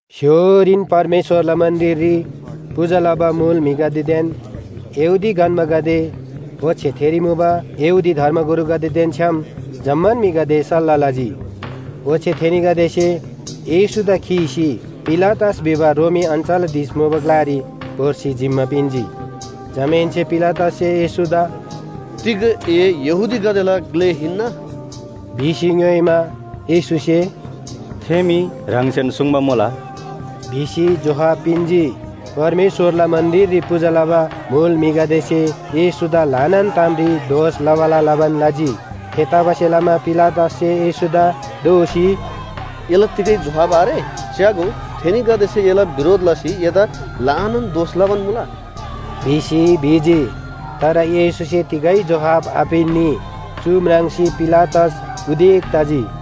स्‍य्‍होरीन परमेश्‍वरला मन्‍दिररी पूजा लबा मुल म्‍हिगदेदेन यहूदी गन्‍बागदे ओच्‍छे थेरी मुबा यहूदी धर्मगुरुगदेदेन छ्‌याम जम्‍मान म्‍हिगदे सल्‍लाह लजी। ओच्‍छे थेनीगदेसे येशूदा खीसी पिलातस भिबा रोमी अञ्‍चलाधीश मुबा ग्‍लारी भोर्सी जिम्‍मा पिन्‍जी। जमाहेन्‍से पिलातससे येशूदा “तिग ए यहूदीगदेला ग्‍ले हिन्‍ना?” भिसी ङ्‌योइमा, येशूसे “थे मी ह्राङसेन सुङ्बा मुला” भिसी जोहाब पिन्‍जी। परमेश्‍वरला मन्‍दिररी पूजा लबा मुल म्‍हिगदेसे येशूदा ल्‍हानान तामरी दोष लबाला लबान लजी। थेतबासेलमा पिलातससे येशूदा दोःसी, “एला तिगै जोहाब आरे? च्‍यागो, थेनीगदेसे एला बिरोध लसी एदा ल्‍हानान दोष लबान मुला” भिसी भिजी। तर येशूसे तिगै जोहाब आपिन्‍नी। चु म्राङ्सी पिलातस उदेक तजी।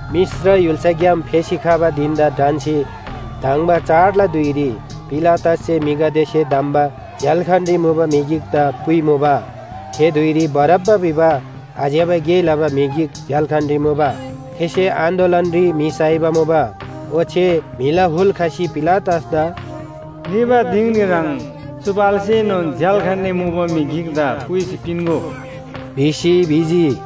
मिश्र य्‍हुल्‍साग्‍याम फेसी खबा धिन‍दा ढन्‍सी धङ्बा चाडला धुइरी पिलातससे म्‍हिगदेसे धम्‍बा झ्‍याल्‍खानरी मुबा म्‍हि गिकदा पुइमुबा। थे धुइरी बारब्‍बा भिबा आज्‍यबा गे लबा म्‍हि गिक झ्‍याल्‍खानरी मुबा। थेसे आन्‍दोलनरी म्‍हि साइबा मुबा। ओच्‍छे म्‍हिला हुल खसी पिलातसदा “निबा दिङरी ह्रङ् चु पाल्सेनोन झ्‍याल्‍खानरी मुबा म्‍हि गिकदा पुइसी पिन्‍गो” भिसी भिजी।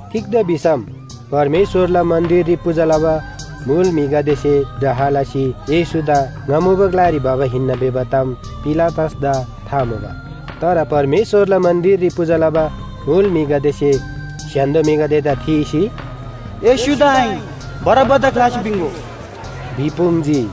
तिग्‍दा भिसम परमेश्‍वरला मन्‍दिररी पूजा लबा मुल म्‍हिगदेसे डाह लसी येशूदा ङा मुबा ग्‍लारी भबा हिन्‍ना भिबा ताम पिलातसदा था मुबा। तर परमेश्‍वरला मन्‍दिररी पूजा लबा मुल म्‍हिगदेसे स्‍य्‍हान्‍दो म्‍हिगदेदा थीसी, “येशूदा आहिन, बारब्‍बादा ख्‍लासी पिन्‍गो!” भिपुङ्जी।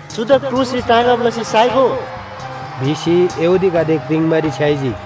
“चुदा क्रुसरी टाँगब लसी साइगो!” भिसी यहूदीगदे क्रिङ्बारी छ्‌याइजी।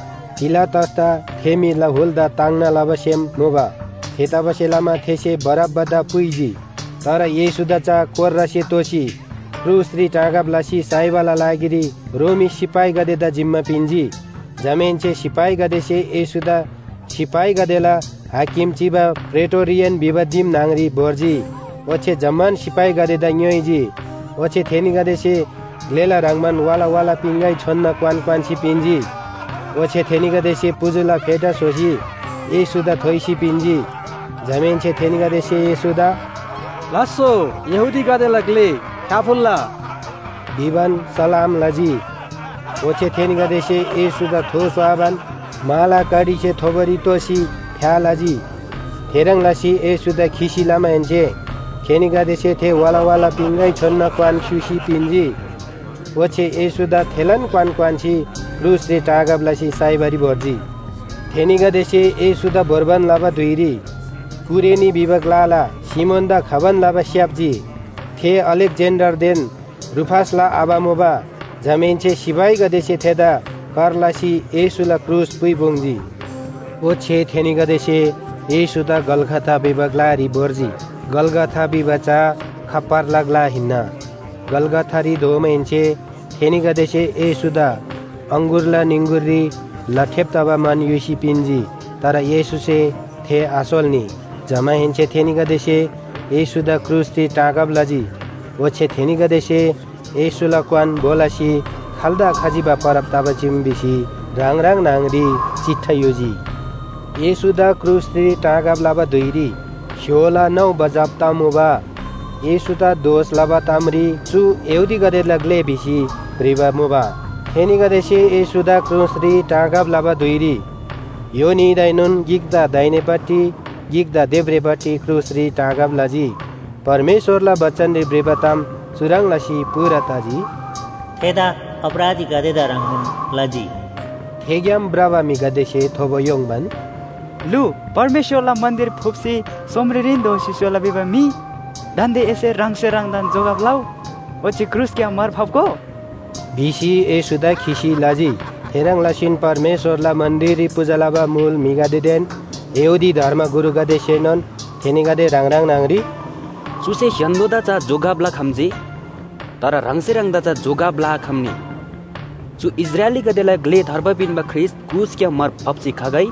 पिलातसदा थे म्‍हिला हुलदा ताङ्ना लबा सेम मुबा। थेतबासेलमा थेसे बारब्‍बादा पुइजी। तर येशूदा चा कोर्रासे तोसी क्रुसरी टाँगब लसी साइबाला लागिरी रोमी सिपाहीगदेदा जिम्‍मा पिन्‍जी। जमाहेन्‍से सिपाहीगदेसे येशूदा सिपाहीगदेला हाकिम चिबा प्रेटोरियन भिबा दिम न्‍हङरी भोर्जी। ओच्‍छे जम्‍मान सिपाहीगदेदा ङ्‌योइजी। ओच्‍छे थेनीगदेसे ग्‍लेला ह्रङ्‌बान वाला वाला पिङगै छोनना क्‍वान क्‍वान्‍सी पिन्‍जी। ओच्‍छे थेनीगदेसे पुजुला फेटा स्‍होसी येशूदा थोइसी पिन्‍जी। जमाहेन्‍से थेनीगदेसे येशूदा “लास्‍सो यहूदीगदेला ग्‍ले, फ्‍याफुल्‍ला” भिबान सलाम लजी। ओच्‍छे थेनीगदेसे येशूदा थो स्‍वाबान माला कडीसे थोबोरी तोसी फ्‍या लजी। थेह्रङ् लसी येशूदा खिसी लमाहेन्‍से थेनीगदेसे थे वाला वाला पिङगै छोनना क्‍वान स्‍युसी पिन्‍जी। ओच्‍छे येशूदा थेलान क्‍वान क्‍वान्‍सी क्रुसरी टाँगब लसी साइबारी भोर्जी। थेनीगदेसे येशूदा भोर्बान लबा धुइरी कुरेनी भिबा ग्‍लाला सिमोनदा खबान लबा स्‍याप्‍जी। थे अलेक्‍जेन्‍डरदेन रूफसला आबा मुबा। जमाहेन्‍से सिपाहीगदेसे थेदा कर लसी येशूला क्रुस पुइपुङ्जी। ओच्‍छे थेनीगदेसे येशूदा गलगथा भिबा ग्‍लारी भोर्जी। गलगथा भिबा चा “खप्‍परला ग्‍ला” हिन्‍ना। गलगथारी धोमाहेन्‍से थेनीगदेसे येशूदा अङगुरला निङगुरी लठेब तबा मन युसी पिन्‍जी। तर येशूसे थे आसोल्‍नी। जमाहेन्‍से थेनीगदेसे येशूदा क्रुसरी टाँगब लजी। ओच्‍छे थेनीगदेसे येशूला क्‍वान भो लसी खाल्‍दा खजिबा परब तबा चीम भिसी ह्राङ ह्राङ न्‍हङरी चिट्ठा युजी। येशूदा क्रुसरी टाँगब लबा धुइरी स्‍य्‍होला नौ बजब तमुबा। येशूदा दोष लबा तामरी “चु यहूदीगदेला ग्‍ले” भिसी भ्रिबा मुबा। थेनीगदेसे येशूदा क्रुसरी टाँगब लबा धुइरी य्‍हो न्‍हीदाएनोन गिकदा दाहिनेपट्टि गिकदा देब्रेपट्टि क्रुसरी टाँगब लजी। परमेश्‍वरला बचनरी भ्रिबा ताम चुह्रङ् लसी पूरा तजी, “थेदा अपराधीगदेदा ह्रङ्नोन लजी।” थेग्‍याम भ्रबा म्‍हिगदेसे थोबो य्‍होङ्बान, “लु, परमेश्‍वरला मन्‍दिर फुप्‍सी सोमरेरीन दोःसी स्‍होला भिबा म्‍हि दान्‍दे एसे ह्राङसे ह्राङदान जोगब लउ, ओच्‍छे क्रुसग्‍याम मार फाप्‍गो” भिसी येशूदा खिसी लजी। थेह्रङ् लसीन परमेश्‍वरला मन्‍दिररी पूजा लबा मुल म्‍हिगदेदेन यहूदी धर्मगुरुगदेसेएनोन थेनीगदे ह्राङ ह्राङ न्‍हङरी, “चुसे स्‍य्‍हान्‍दोदा चा जोगब लखम्‍जी। तर ह्राङसे ह्राङदा चा जोगब लआखम्‍नी। चु इस्राएलीगदेला ग्‍ले थार्बा पिन्‍बा ख्रीष्‍ट क्रुसग्‍याम मार फाप्‍सी खगै,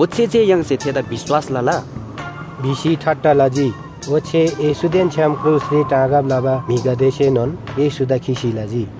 ओच्‍छे जे य्‍हाङसे थेदा विश्‍वास लला!” भिसी ठट्टा लजी। ओच्‍छे येशूदेन छ्‌याम क्रुसरी टाँगब लबा म्‍हिगदेसेनोन येशूदा खिसी लजी।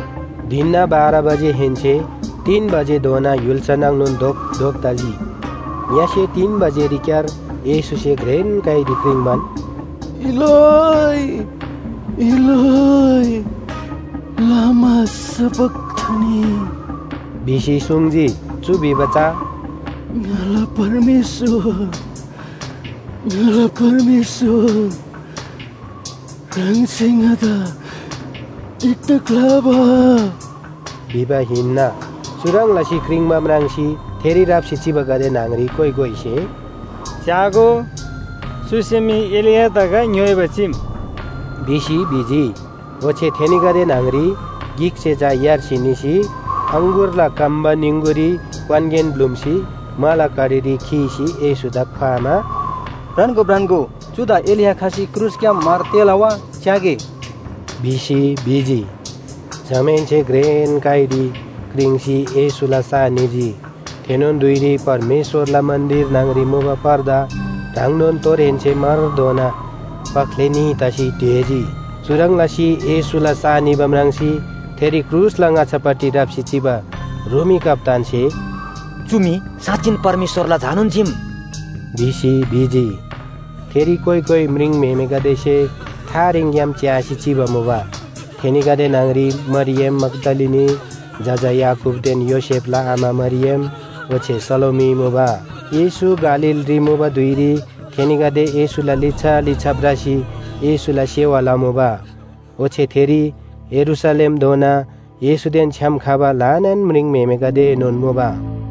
धिनना बाह्र बजेहेन्‍से तीन बजेधोना य्‍हुल्‍सा नाङनोन धोपधोप तजी। ङ्‍यसे तीन बजेरीक्‍यार येशूसे घ्रेन काइरी क्रिङ्बान, “इलोइ इलोइ लामा सबखथनी?” भिसी सुङ्जी। चु भिबा चा “ङाला परमेश्‍वर, ङाला परमेश्‍वर, ह्राङसे ङादा तिग्‍दा ख्‍लाबा?” भिबा हिन्‍ना। चुह्रङ् लसी क्रिङ्बा म्राङ्सी थेरी राप्‍सी चिबागदे न्‍हङरी कोइ कोइसे “च्‍यागो, चुसे मी एलियादा गा ङ्‌योइबा चीम” भिसी भिजी। ओच्‍छे थेनीगदे न्‍हङरी गिकसे चा यार्सी निसी अङगुरला कम्‍बा निङगुरी क्‍वानगेन ब्‍लुम्‍सी माला कडीरी खीसी येशूदा ख्‍वामा, “भ्रान्‍गो, भ्रान्‍गो, चुदा एलिया खसी क्रुसग्‍याम मार तेःला वा? च्‍यागे” भिसी भिजी। जमाहेन्‍से घ्रेन काइरी क्रिङ्सी येशूला सा निजी। थेनोन धुइरी परमेश्‍वरला मन्‍दिर न्‍हङरी मुबा पर्दा ह्राङनोन तोरहेन्‍से मारधोना पख्‍ले न्‍ही तसी ढेजी। चुह्रङ् लसी येशूला सा निबा म्राङ्सी थेरी क्रुसला ङाच्‍छापट्टि राप्‍सी चिबा रोमी कप्‍तानसे “चु मी साँच्‍चिन परमेश्‍वरला झानोन चीम” भिसी भिजी। थेरी कोइ कोइ म्रिङम्‍हेमेगदेसे थारेङग्‍याम च्‍यासी चिबा मुबा। थेनीगदे न्‍हङरी मरियम मग्‍दलिनी, जजा याकूबदेन योसेफला आमा मरियम ओच्‍छे सलोमी मुबा। येशू गालीलरी मुबा धुइरी थेनीगदे येशूला लिच्‍छा लिच्‍छा भ्रसी येशूला सेवा लमुबा। ओच्‍छे थेरी यरूशलेमधोना येशूदेन छ्‌याम खबा ल्‍हानान म्रिङम्‍हेमेगदेएनोन मुबा।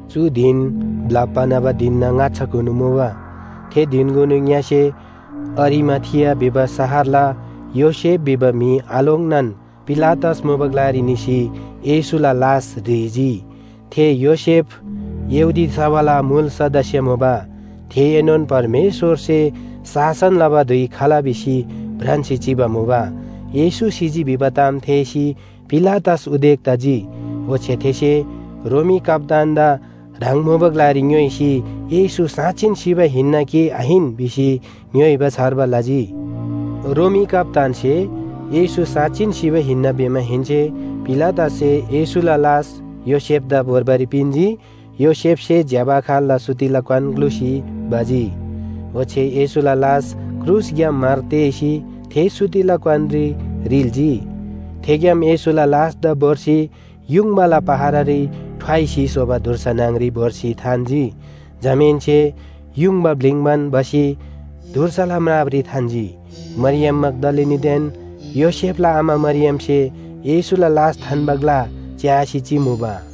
चु धिन ब्‍लप्‍बा न्‍हबा धिनना ङाच्‍छाकुनु मुबा। थे धिनकुनु ङ्‍यसे अरिमाथिया भिबा शहरला योसेफ भिबा म्‍हि आलोङ्नान पिलातस मुबा ग्‍लारी निसी येशूला लास ह्रीजी। थे योसेफ यहूदी सभाला मुल सदस्‍या मुबा। थेएनोन परमेश्‍वरसे शासन लबा धुइ खला भिसी भ्रान्‍सी चिबा मुबा। येशू सिजी भिबा ताम थेःसी पिलातस उदेक तजी। ओच्‍छे थेसे रोमी कप्‍तानदा ह्राङ मुबा ग्‍लारी ङ्‌योइसी येशू साँच्‍चिन सिबा हिन्‍ना कि आहिन भिसी ङ्‌योइबा छार्बा लजी। रोमी कप्‍तानसे येशू साँच्‍चिन सिबा हिन्‍ना भिमाहेन्‍से पिलातससे येशूला लास योसेफदा भोर्बारी पिन्‍जी। योसेफसे ज्‍यबा खाल्‍ला सुतिला क्‍वान ग्‍लुसी भजी। ओच्‍छे येशूला लास क्रुसग्‍याम मार तेःसी थे सुतिला क्‍वानरी रिल्‍जी। थेग्‍याम येशूला लासदा भोर्सी युङबाला पहरारी ठ्वाइसी स्‍होबा धुर्सा न्‍हङरी भोर्सी थान्‍जी। जमाहेन्‍से युङबा ब्‍लिङ्बान भसी धुर्साला म्रापरी थान्‍जी। मरियम मग्‍दलिनीदेन योसेफला आमा मरियमसे येशूला लास थान्‍बा ग्‍ला च्‍यासी चिमुबा।